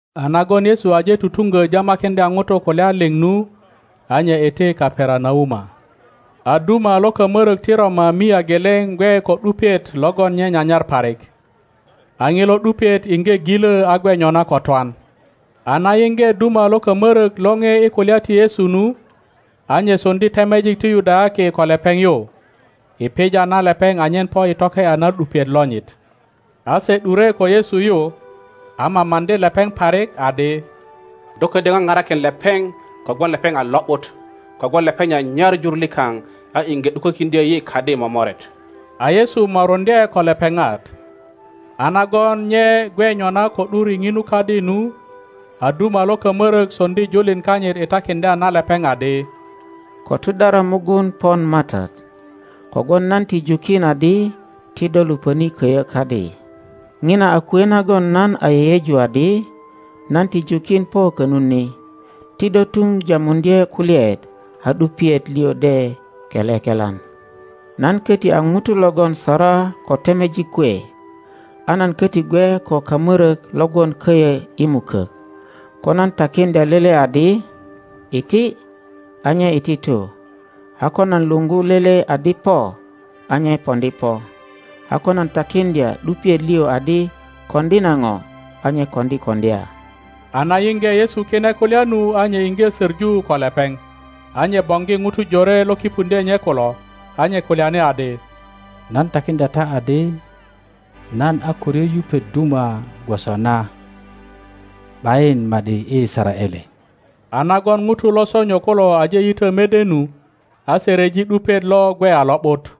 A nagon Yesu aje tutuŋgo jama-kiŋdya ŋutu kulya liŋ nu, a nye iti Kaperanauma. A duma lo kamorok ti Roma mia geleŋ gwe ko ’dupiet logon nye nyanyar parik. A ŋilo ’dupiet iŋge ŋilo a gwe nyona ko twan. A na yiŋge duma lo kamorok lore i kulya ti Yesu nu, a nye soŋdi temejik ti Yudayaki ko lepeŋ yu, i pija na lepeŋ anyen po i toke ’ya na ’dupiet lonyit. A se ’dure ko Yesu yu, a mamaŋdi lepeŋ parik, adi, Do ködyö ŋaparakin lepeŋ kogwon lepeŋ a lo ’but, kogwon lepeŋ nyanyar jur likaŋ a iŋge ’dukokiŋdyö yi kadi momoret. a Yesu moruŋdye ko lepeŋat. A nagon nye gwe nyona ko ’dur i ŋinu kadi nu, a duma lo kamörök soŋdi julin kanyit i takiŋdya na lepeŋ adi, Ko tudara mugun pon MATAT, kogwon nan ti jukin adi ti do lupöni koyo kadi. Ŋina a kwe nagon nan a yeyeju adi nan ti jukin po konut ni; ti do tun Tamuŋdye kulyaet, a ’dupiet liŋ de kele kelan. Nan koti a nuto logon sara ko temejik kwe, a nan koti gwe ko kamorok lo gwon koyo i mukok. Ko nan takiŋdya lele adi, Iti, a nye iti tu; a ko nan luŋgu lele adi, Po, a nye poŋdi po; a ko nan takiŋdya ’dupiet liŋ adi, Koŋdi na ŋo, a nye koŋdi koŋdya. A na yinge Yesu kine kulya nu a nye iŋge söŋu ko lepeŋ, a nye boŋgi ŋutu jore lo kipuŋdyo nye kulo, a nye kulyani adi, Nan takiŋdya ta adi, Nan a ko ryo yupet duma gwoso na ’bayin ma ’di i Yisaraele. A nagon ŋutu lo sonyo kulo aje yito mede nu, a se ryeji ’dupiet lo gwe a lo ’but.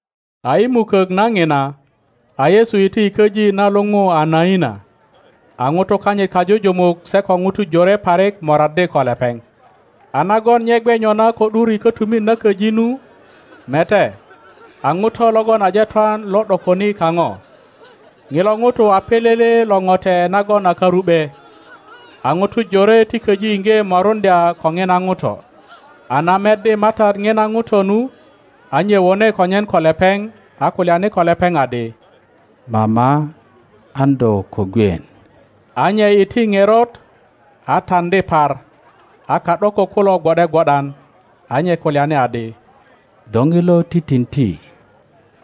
A i mukok na ŋina, a Yesu iti i köji na luŋu a Naina, a ŋutu kanyit kajujumuk se ko ŋutu jore parik moraddi ko lepeŋ. A nagon nye gwe nyona ko ’dur i kötumit na köji nu, mete, a nuto logon aje twan lo ’dokoni kano. Ŋilo nuto a pilili lo ŋote nagon a karu ’be. A nutu jore ti köji inge moruŋdya ko nina nuto. A na meddi MATAT nina nuto nu, a nye wone konyen ko lepeŋ, a kulyani ko lepeŋ adi, Mama, an do ko gwien. A nye iti nerot, a taŋdi par, a ka ’dokök kulo gwo ’de gwo ’dan. A nye kulyani adi, Do nilo titinti,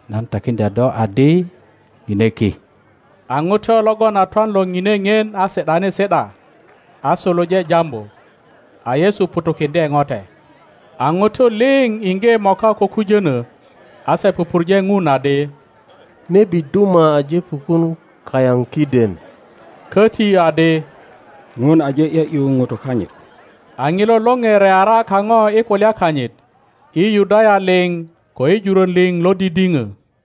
nan takiŋdya do adi, Ŋine ki. A nuto logon a twan lo nine ŋien a si ’dani si ’da, a suluje jambu. A Yesu ŋutukiŋdye note. A nutu liŋ inge moka ko kujono, a se pupurje Ŋun adi, Nebi duma aje pukun kayan kiden, koti adi, Ŋun aje ’yo ’yu nutu kanyit. A nilo lore reara kano i kulya kanyit, i Yudaya liŋ ko i juron liŋ lo didino.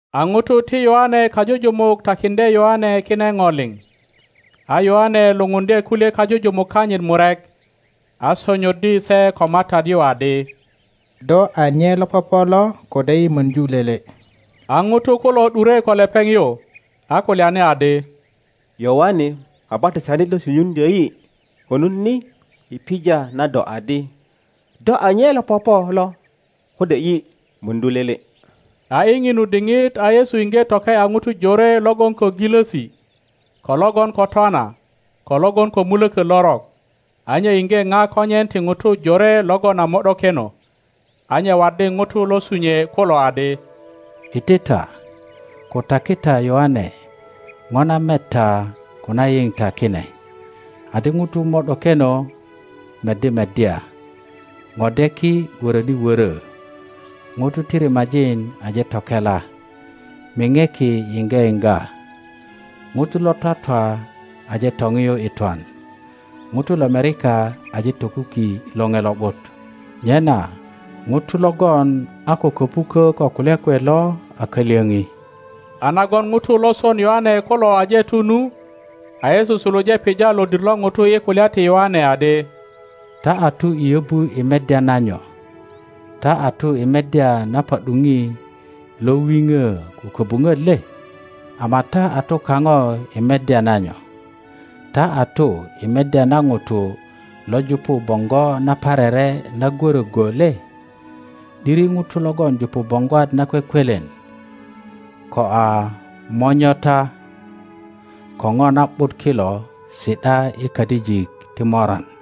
A nutu ti Yoane kajujumuk takindye Yoane kine no liŋ. A Yoane lupundye kulye kajujumuk kanyit murek, a sonyoddi se ko MATAT yu adi, Do a nye lo popo lo kode yi mordu lele? A nutu kulo ’dure ko lepeŋ yu, a kulyani adi, Yoane Kabatisanit lo sunyuŋdyo yi konut ni i pija na do adi, Do a nye lo popo lo kode yi mordu lele? A i ŋinu diŋit a Yesu inge toke ’ya nutu jore logon ko gilosi, ko logon ko twana, ko logon ko muloko lorok, a nye inge na konyen ti nutu jore logon a mo ’dokeno. A nye waddi nutu lo sunyue kulo adi, Iti ta, ko taki ta Yoane no na met ta ko na yin ta kine, adi nutu mo ’dokeno meddi meddya, nodeki woroni woro, nutu ti rimajin aje tokela, mineki yinge yinga, nutu lo twatwa aje toniyu i twan, nutu lomerika aje tokuki Loŋe Lo ’but; nyena nuto logon a ko kopuko ko kulya kwe lo a kalyoni. A nagon nutu lo son Yoane kulo aje tu nu, a Yesu suluje pija lodir lo nutu i kulya ti Yoane adi, Ta a tu i yobu i meddya na nyo? Ta a tu i meddya na pa ’duni lo wino ko kobunot le? Ama ta a tu kano i meddya na nyo? Ta a tu i meddya na ŋuto lo jupu bongo naparere na gworo go le? ’Diri nutu logon jupu boŋgwat nakwekwelen ko a monyota ko no na ’but kilo si ’da i kadijik ti moran.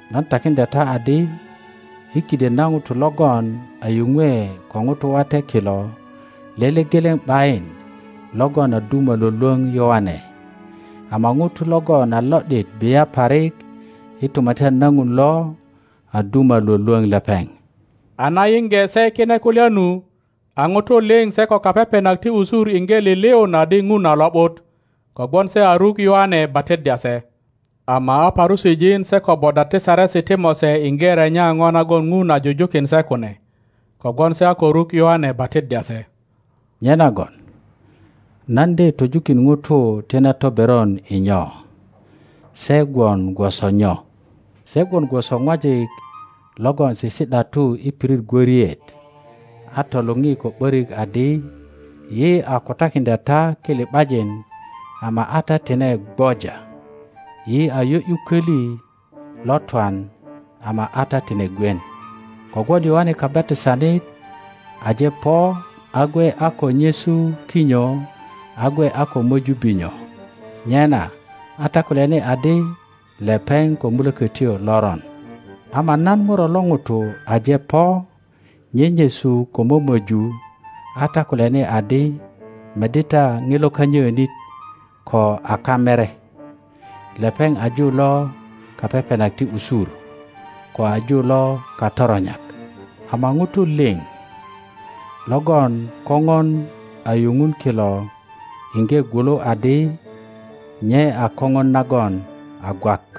Nan takiŋdya ta adi, i kiden na nutu logon a yunwe ko nutu wate kilo lele gelen ’bayin logon a duma lwolwon Yoane; ama nuto logon a lo ’dit bia parik i Tumatyan na Ŋun lo a duma lwolwon lepeŋ. A na yinge se kine kulya nu, a nuto liŋ se ko kapepenak ti usur inge liliun adi Ŋun a lo ’but, kogwon se a ruk Yoane batiddya se. Ama a Parusijin se ko bodwat ti Saresi ti Mose inge renya no nagon ŋun a jujukin se kune, kogwon se a ko ruk Yoane batiddya se. Nyenagon nan de töjukin nutu ti na toberon i nyo? Se gwon gwoso nyo? Se gwon gwoso ŋwajik logon sisi ’datu i pirit gworiet a toluŋi ko ’börik adi, Yi a kutakiŋdya ta kili ’bajin, ama a ta tine gwoja; yi a yo ’yu köli lo twan, ama a ta tine gwien. Kogwon Yoane Kabatisanit aje po a gwe a ko nyesu kinyo a gwe a ko möju binyo, nyena a ta kulyani adi, Lepeŋ ko mulökötyo loron. Ama nan Ŋuro lo ŋuto aje po nyenyesu ko mömöju, a ta kulyani adi, Meddi ta ŋilo kanyöönit, ko a kamere. Lepeŋ a ju lo kapepenak ti usur, ko a ju lo katoronyak. Ama ŋutu liŋ logon Koŋon a yuŋun kilo iŋge gwulu adi nye a Koŋon nagon a gwak.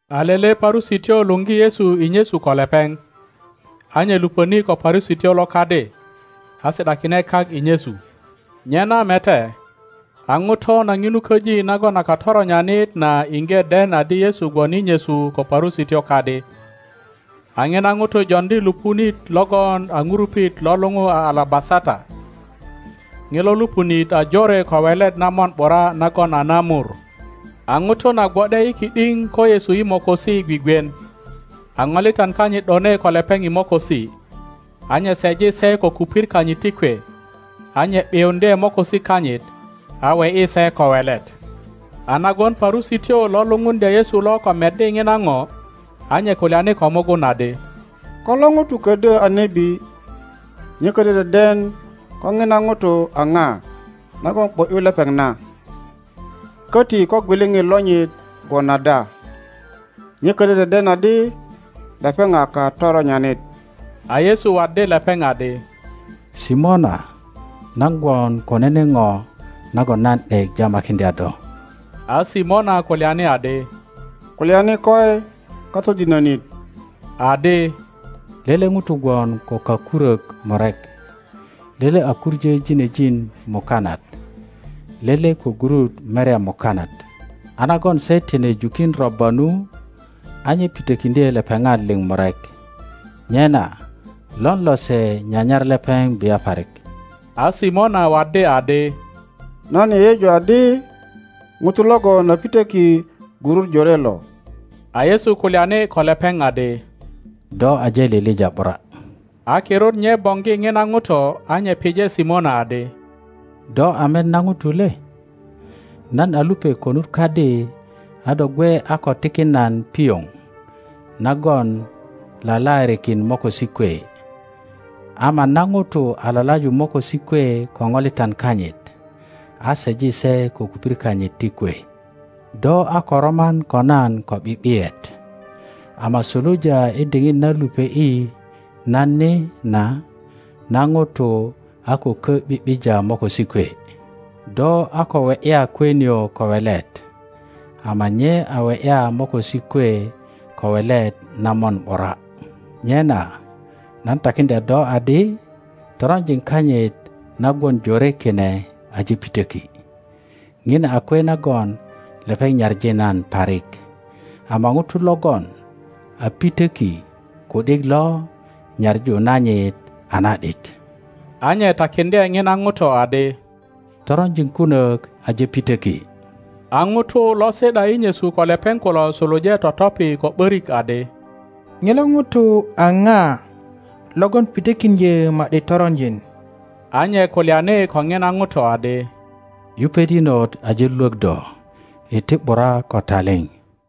A lele Parusityo luŋgi Yesu i nyesu ko lepeŋ; a nye lupöni ko Parusityo lo kadi, a si ’dakine kak i nyesu. Nyena mete, a ŋuto na ŋinu köji nagon a katoronyanit na iŋge den adi Yesu gwon i nyesu ko Parusityo kadi, a ŋina ŋuto joŋdi lupunit logon a ŋurupit lo luŋu a alabasata. Ŋilo lupunit a jore ko welet na mon ’bura nagon a na mur. A ŋuto na gwo ’de i ki ’diŋ ko Yesu i mokosi gwigwien, a ŋolitan kanyit ’done ko lepeŋ i mokosi, a nye seji se ko kupir kanyit ti kwe, a nye ’biuŋdye mokosi kanyit, a we ’yi se ko welet. A nagon Parusityo lo lupuŋdya Yesu lo ko meddi ŋina ŋo, a nye kulyani ko mugun adi, Ko lo ŋuto ködyö a nebi, nye ködyö deden ko ŋina ŋuto a ŋa nagon ’bo ’yu lepeŋ na, köti ko gwiliŋit lonyit gwon ada. Nye ködyö deden adi lepeŋ a katoronyanit. a Yesu waddi lepeŋ adi, Simona, nan gwon ko nene ŋo nagon nan ’dek jamakiŋdya do. A Simona kulyani adi, Kulyani koi, Katodinönit. Adi, Lele ŋuto gwon ko kakurök murek; lele a kuŋö ginejin mukanat, lele ko gurut merya mukanat. A nagon se tine jukin robba nu, a nye pitökiŋdye lepeŋat liŋ murek. Nyena lon lose nyanyar lepeŋ bia parik? A Simona waddi adi, Nan yeyeju adi ŋuto logon a pitöki gurut jore lo. A Yesu kulyani ko lepeŋ adi, Do aje lilija ’bura. A kirut nye boŋgi ŋina ŋuto a nye pije Simona adi, Do a met na ŋuto le? Nan a lupe konut kadi a do gwe a ko tikin nan pioŋ nagon lalaarikin mokosi kwe, ama na ŋuto a lalaju mokosi kwe ko ŋolitan kanyit, a seji se ko kupir kanyit ti kwe. Do a ko roman ko nan ko ’bi ’biyet, ama suluja i diŋit na lupe ’i nan ni na, na ŋuto a ko kö ’bi ’bija mokosi kwe. Do a ko we ’ya kwe nio ko welet, ama nye a we ’ya mokosi kwe ko welet na mon ’bura. Nyena nan takiŋdya do adi, Toronjin kanyit na gwon jore kine aje pitöki; ŋina a kwe nagon lepeŋ nyaŋi nan parik; ama ŋuto logon a pitöki ku ’dik lo nyaŋu nanyit a na ’dit. a nye takiŋdye ŋina ŋuto adi, Toronjin kunök aje pitöki. a ŋutu lo si ’da i nyesu ko lepeŋ kulo suluje totopi ko ’börik adi, Ŋilo ŋuto a ŋa logon pitökiŋdyö ma ’di toronjin? A nye kulyani ko ŋina ŋuto adi, Yupet inot aje lwök do. Iti ’bura ko taliŋ.